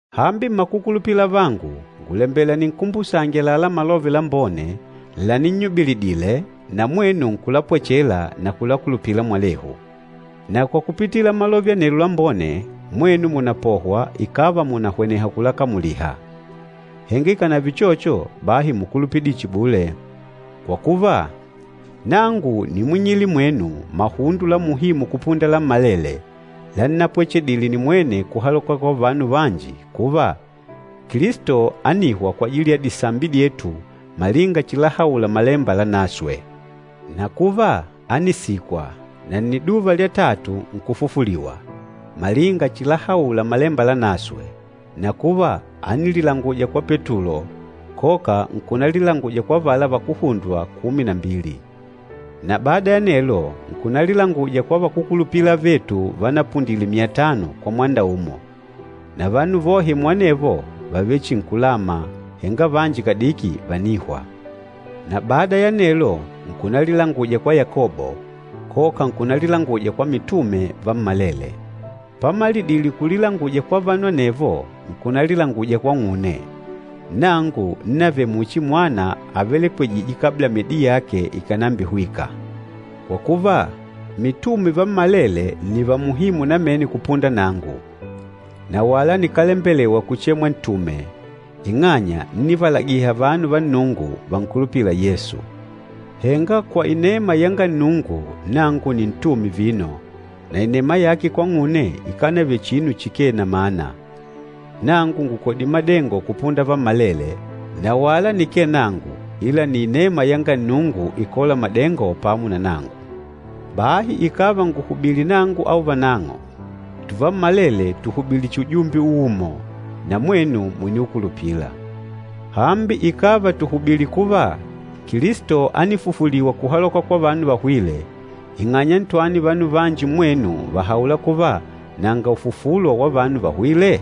Hambi mmakukulupila avangu, ngùlembela ninkumbusange àlalá Malove Lambone laninnyubilidile, na mwenu nkulapwechela na kulakulupila mwalehu. Na kwa kupitila Malove anelo Lambone mwenu mùnapohwa ikàva mùnahweneha kulakamuliha. Henga ikànave uchocho, bahi múkulupidile chihi bule. Kwa kuva, nangu nímwing'ile mwenu mahundo la muhimu kupunda lammalele, lannapwechedile nimwene kuhaloka kwa vanu vanji kuva, Kilisto ánihwa kwajili ya disambi dyetu malinga chilahaula Malemba Lanaswe, na kuva, ánisikwa, na nniduva lya tatu nkufufuliwa, malinga chilahaula Malemba Lanaswe, na kuva, ánililanguja kwa Petulo, koka nkunalilanguja kwa avala vakuhundwa kumi na mbili. Na bada ya anelo, nkunalilanguja kwa vakúkulupila avetu vanapundile myatano kwa mwanda umo. Na vanu vohe muanevo vàvele chihi nkulama, henga vanji kadiki vànihwa. Na bada ya anelo, nkunalilanguja kwa Yakobo, koka nkunalilanguja kwa mitume vammalele. Pamalidile kulilanguja kwa vanu anevo, nkunalilanguja kwang'une, nangu ńnavele muchi mwana avelekwejîje kabla myedi yake ikànambihwika. Kwa kuva, mitume vammalele nni va muhimu namene kupunda nangu, na wala nikálembelewa kuchemwa ntume, ing'anya ńnivalagiha vanu va Nnungu vankulupîla Yesu. Henga kwa inema yanga Nnungu, nangu nni ntume vino, na inema yake kwang'une ikánavele chihi chinu chikee na mana. Nangu ngùkodile madengo kupunda vammalele, na wala nikee nangu, ila nni inema yanga Nnungu ikôla madengo pamo na nangu. Bahi ikàva ngùhubili nangu au vanang'o, tuvammalele tùhubili chihi ujumbe uumo, na mwenu mùniukulupila. Hambi ikàva tùhubili kuva, Kilisto ánifufuliwa kuhaloka kwa vanu vahwîle, ing'anya ntwani vanu vanji mmwenu vàhaula kuva, nanga ufufulo wa vanu vahwîle?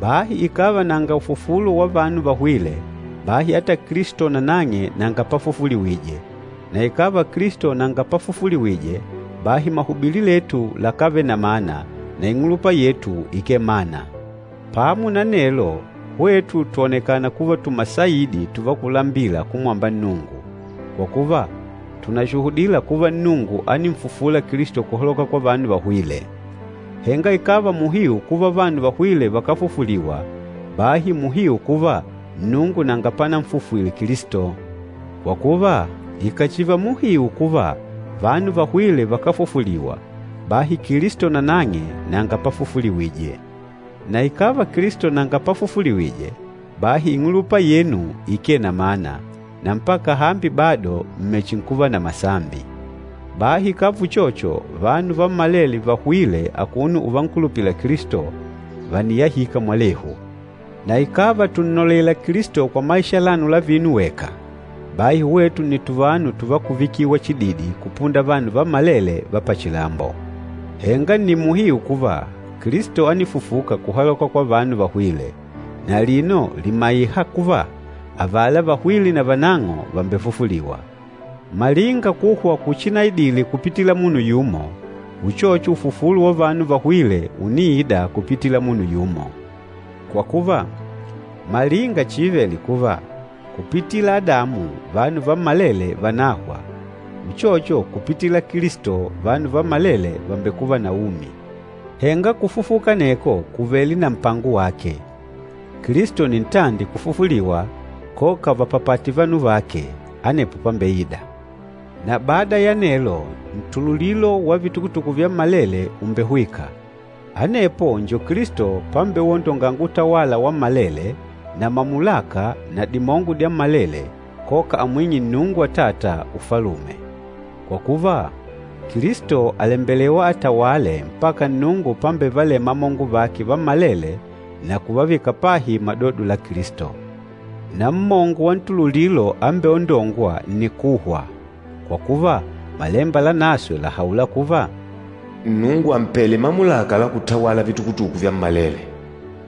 Bahi ikàva nanga ufufulo wa vanu vahwîle, bahi ata Kilisto nanang'e nanga pafufuliwije, na ikàva Kilisto nanga pafufuliwije, bahi mahubili letu lakávele na mana na ing'ulupa yetu ikee mana. Pamo na anelo, hwetu twònekana kuva tumasaidi tuvakulambila kumwamba Nnungu, kwa kuva tùnashuhudila kuva Nnungu áninfufula Kilisto kuhaloka kwa vanu vahwîle. Henga ikàva muhiu kuva vanu vahwîle vakáfufuliwa, bahi muhiu kuva Nnungu nanga pananfufwile Kilisto. Kwa kuva, ikàchiva muhiu kuva vanu vahwîle vakáfufuliwa, bahi Kilisto nanang'e nanga pafufuliwije. Na ikàva Kilisto nanga pafufuliwije, bahi ing'ulupa yenu ikee na mana, na mpaka hambi bado m̀mechinkuva na masambi. Bahi ikàva uchocho, vanu vammalele vahwîle akuno uvankulupila Kilisto, vàniyahika mwalehu. Na ikàva tùnnolela Kilisto kwa maisha alano la vino weka, bahi hwetu nni tuvanu tuvakuvikiwa chididi kupunda vanu vammalele va pachilambo. Henga nni muhiu kuva, Kilisto ánifufuka kuhaloka kwa vanu vahwîle, na alino lìmaiha kuva, avala vahwîle navanang'o vàmbefufuliwa. Malinga kuhwa kuchinaidile kupitila munu yumo, uchocho ufufulo wa vanu vahwîle ùniida kupitila munu yumo. Kwa kuva, malinga chiivele kuva, kupitila Adamu vanu vammalele vànahwa, uchocho kupitila Kilisto vanu vammalele vàmbekuva na umi. Henga kufufuka aneko kùvele na mpango wake. Kilisto nni ntandi kufufuliwa koka vapapate vanu vake, anepo pambeida. Na bada ya anelo, ntululilo wa vitukutuku vyammalele ùmbehwika. Anepo njo Kilisto pambewondonga utawala wammalele, na mamulaka na dimongo dyammalele, koka amwing'e Nnungu Atata Ufalume. Kwa kuva, Kilisto àlembelewa atawale mpaka Nnungu pambevalema amongo vake vammalele na kuvavika pahi madodo la Kilisto. Na mmongo wa ntululilo ámbeondongwa nni kuhwa. Kwa kuva, Malemba Lanaswe làhaula kuva, “Nnungu àmpele mamulaka la kutawala vitukutuku vyammalele.”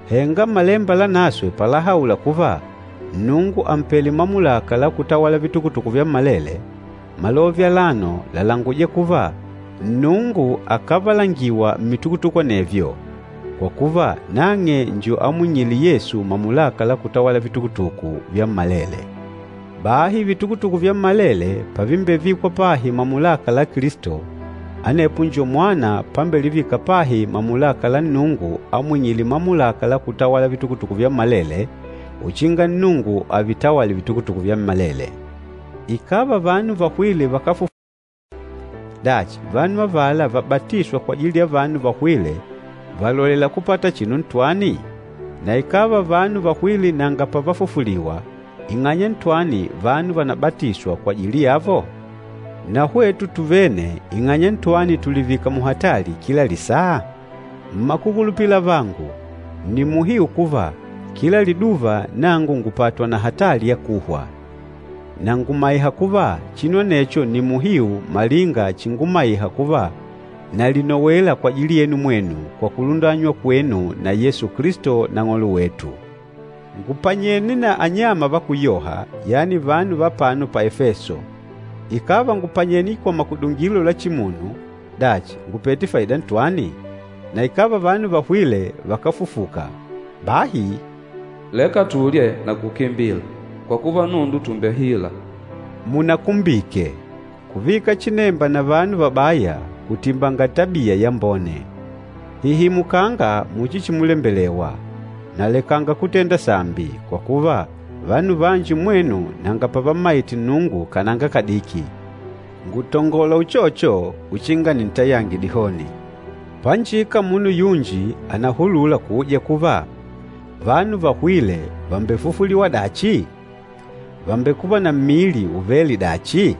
Henga Malemba Lanaswe palahaula kuva, “Nnungu àmpele mamulaka la kutawala vitukutuku vyammalele,” malove alano làlanguja kuva Nnungu akávalangiwa mmitukutuku anevyo, kwa kuva nang'e njo amwingîle Yesu mamulaka la kutawala vitukutuku vyammalele. Bahi vitukutuku vyammalele pavimbevikwa pahi mamulaka la Kilisto, anepo njo Mwana pambelivika pahi mamulaka la Nnungu amwing'île mamulaka la kutawala vitukutuku vyammalele uchinga Nnungu avitawale vitukutuku vyammalele. Ikàva vanu vahwîle vakáfufuliwa, dachi vanu avala vabatîswa kwajili ya vanu vahwîle vàlolela kupata chinu ntwani? Na ikàva vanu vahwîle nanga pavafufuliwa, ing'anya ntwani vanu vànabatiswa kwajili yavo? Na hwetu tuvene, ing'anya ntwani tùlivika muhatali kila lisaa? Mmakukulupila avangu, nni muhiu kuva kila liduva nangu ngùpatwa na hatali ya kuhwa! Na ngùmaiha kuva chinu anecho nni muhiu malinga chingumaiha kuva nalinowela kwajili yenu mwenu kwa kulundanywa kwenu na Yesu Kilisto Nang'olo wetu. Ngùpanyene na anyama vakúyoha, yani vanu va apano pa Efeso. Ikàva ngùpanyene kwa makudungilo la chimunu, dachi ngùpete faida ntwani? Na ikàva vanu vahwîle vakáfufuka, bahi, “Leka tulye na kukimbila, kwa kuva nundu tùmbehila.” Munakumbike, “Kuvika chinemba na vanu vabaya, kùtimbanga tabia yambone.” Hihimukanga muchi chimulembelewa, na lekanga kutenda sambi, kwa kuva vanu vanji mmwenu nanga pavammaite Nnungu kananga kadiki. Ngùtongola uchocho uchinga nintayange dihoni. Panjika munu yunji ànahulula kuuja kuva, “Vanu vahwîle vàmbefufuliwa dachi? Vàmbekuva na mmili uvêle dachi?”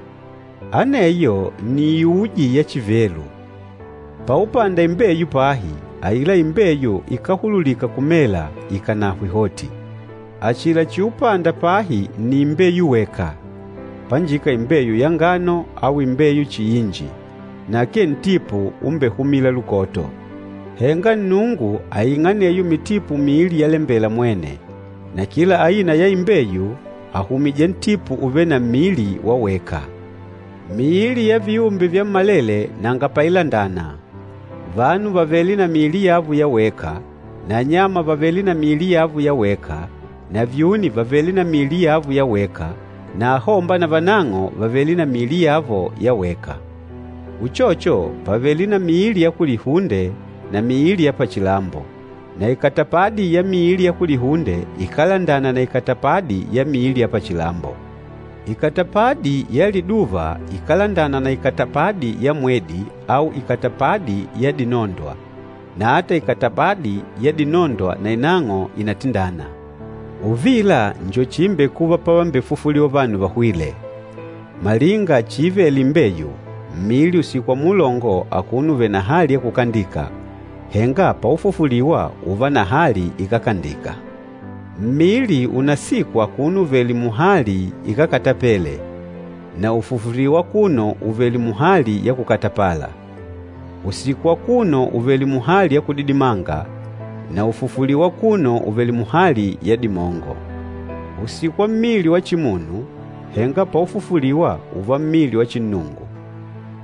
Aneyo nni iuji ya chivelu! Paupanda imbeyu pahi, aila imbeyu ikáhululika kumela ikànahwe hoti. Achila chiupanda pahi nni imbeyu weka, panjika imbeyu ya ngano au imbeyu chihi inji, na akee ntipu umbehumîla lukoto. Henga Nnungu àing'a aneyo mitipu miili yalembela mwene, na kila aina ya imbeyu àhumija ntipu uvêle na mmili wa weka. Miili ya viumbe vyammalele nanga pailandana. Vanu vàvele na miili yavo ya weka, na anyama vàvele na miili yavo ya weka, na vyuni vàvele na miili yavo ya weka, na ahomba na vanang'o vàvele na miili yavo ya weka. Uchocho, pàvele na miili ya kulihunde na miili ya pachilambo, na ikatapadi ya miili ya kulihunde ikálandana na ikatapadi ya miili ya pachilambo. Ikatapadi ya liduva ikálandana na ikatapadi ya mwedi au ikatapadi ya dinondwa, na ata ikatapadi ya dinondwa nainang'o ìnatindana. Uvila njo chiimbekuva pavambefufuliwa vanu vahwîle. Malinga chiivele imbeyu, mmili ùsikwa muulongo akuno uvèlè na hali ya kukandika, henga paufufuliwa ùùva na hali ikákandika. Mmili ùnasikwa akuno uvèlè muhali ikákatapele, na ùfufuliwa akuno uvèlè muhali ya kukatapala, ùsikwa akuno uvèlè muhali ya kudidimanga, na ùfufuliwa akuno uvèlè muhali ya dimongo. Ùsikwa mmili wa chimunu, henga paufufuliwa ùùva mmili wa chinnungu.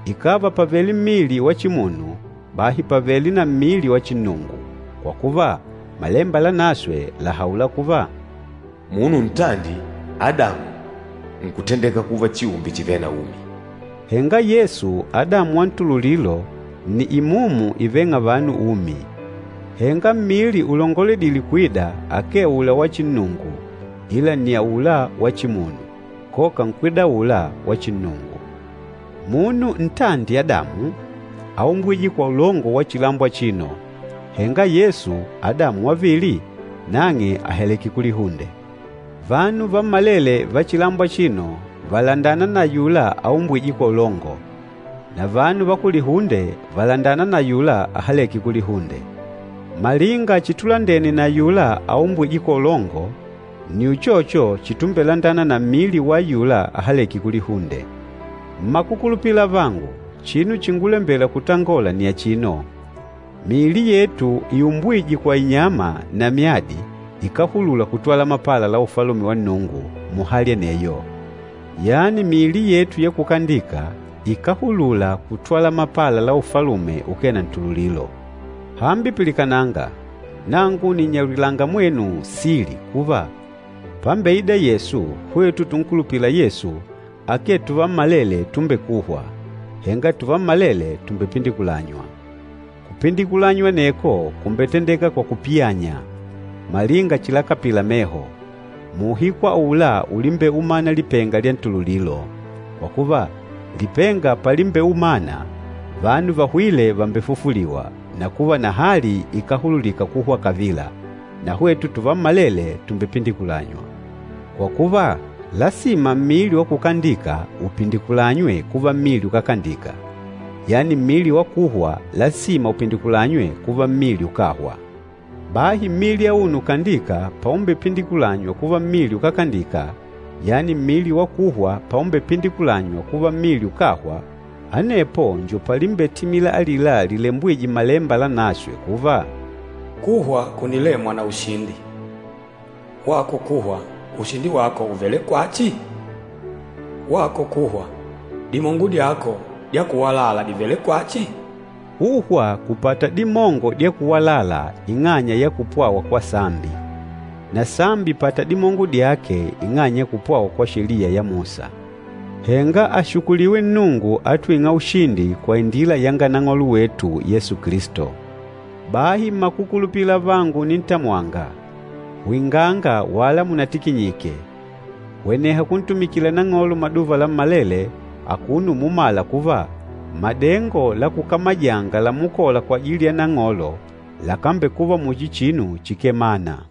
Ikàva pàvele mmili wa chimunu, bahi pàvele na mmili wa chinnungu. Kwa kuva, Malemba Lanaswe làhaula kuva, “Munu ntandi, Adamu, nkutendeka kuva chiumbe chivêle na umi,” henga Yesu, Adamu wa ntululilo, nni imumu ivêng'a vanu umi. Henga mmili ulongoledîle kwida akee aula wa chinnungu ila nni aula wa chimunu, koka nkwida aula wa chinnungu. Munu ntandi Adamu, áumbwije kwa ulongo wa chilambo achino, henga Yesu, Adamu wavili, nang'e àhaleke kulihunde. Vanu vammalele va chilambo achino vàlandana na ayula aumbwîje kwa ulongo, na vanu va kulihunde vàlandana na ayula ahalêke kulihunde. Malinga chitulandene na ayula aumbwîje kwa ulongo, nni uchocho chitumbelandana na mmili wa ayula ahalêke kulihunde. Mmakukulupila avangu, chinu chíngulambèlà kutangola nni achino, miili yetu iumbwîje kwa inyama na myadi ikáhulula kutwala mapala la Ufalume wa Nnungu muhali aneyo, yani miili yetu ya kukandika ikáhulula kutwala mapala la Ufalume ukee na ntululilo. Hambi pilikananga, nangu nìnnyaulilanga mwenu sili kuva, pambeida Yesu hwetu tunkulupîla Yesu, akee tuvammalele tumbekûhwa, henga tuvammalele tùmbepindikulanywa. Kupindikulanywa aneko kumbetendeka kwa kupiyanya, malinga chilakapila meho, muuhiku aula ulimbeumana lipenga lya ntululilo. Kwa kuva, lipenga palimbeumana, vanu vahwîle vàmbefufuliwa na kuva na hali ikáhululika kuhwa kavila, na hwetu tuvammalele tùmbepindikulanywa. Kwa kuva, lasima mmili wa kukandika upindikulanywe kuva mmili ukákandika, yani mmili wa kuhwa lasima upindikulanywe kuva mmili ukáhwa. Bahi mmili auno ukandîka paumbepindikulanywa kuva mmili ukákandika, yani mmili wa kuhwa paumbepindikulanywa kuva mmili ukáhwa, anepo njo palimbetimila alila lilembwîje Mmalemba Lanaswe kuva, “Kuhwa kunilemwa na ushindi.” “Wako kuhwa, ushindi wako ùvele kwachi? Wako kuhwa, dimongo dyako dya kuwalala dìvele kwachi?” Kuhwa kùpata dimongo dya kuwalala ing'anya ya kupwawa kwa sambi, na sambi ìpata dimongo dyake ing'anya ya kupwawa kwa Sheliya ya Musa. Henga ashukuliwe Nnungu atwîng'a ushindi kwa indila yanga Nang'olo wetu Yesu Kilisto! Bahi mmakukulupila avangu unintamwanga, hwinganga wala munatikinyike. Hweneha kuntumikila Nang'olo maduva lammalele akuno umumala kuva madengo la kukamajanga lamukola kwajili ya Nang'olo lakambekuva muchi chinu chikee mana.